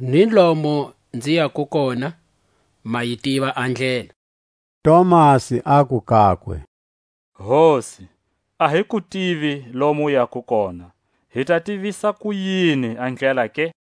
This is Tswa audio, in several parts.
Ni lomo nzi yako kona, ma yi tiva a ndlela. Tomasi aku kakwe: Hosi, a hi ku tivi lomo u yako kona; hi ta tivisa kuyini a ndlela ke?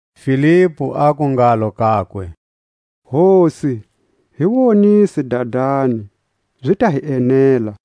Filipu aku ngalo kakwe: Hosi, hi wonise Dadani, zi ta hi enela.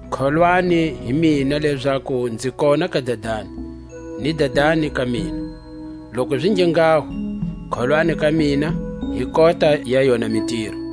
Kholwani hi mina lezaku nzi kona ka Dadani, ni Dadani ka mina; loku zi nge nghaho, kholwani ka mina hi kota ya yona mitiro.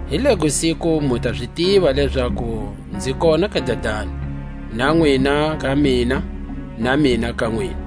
Hi lego siku mu ta zi tiva lezaku nzi kona ka Dadani, na nwina ka mina, na mina ka nwina.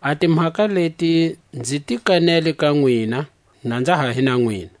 A timhaka leti nzi ti kanele ka nwina, na nza ha hi na nwina.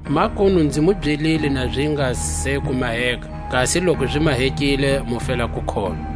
Makunu nzi mu byelile na zi nga se ku maheka, kasi loku zi mahekile mu fela ku kholwa.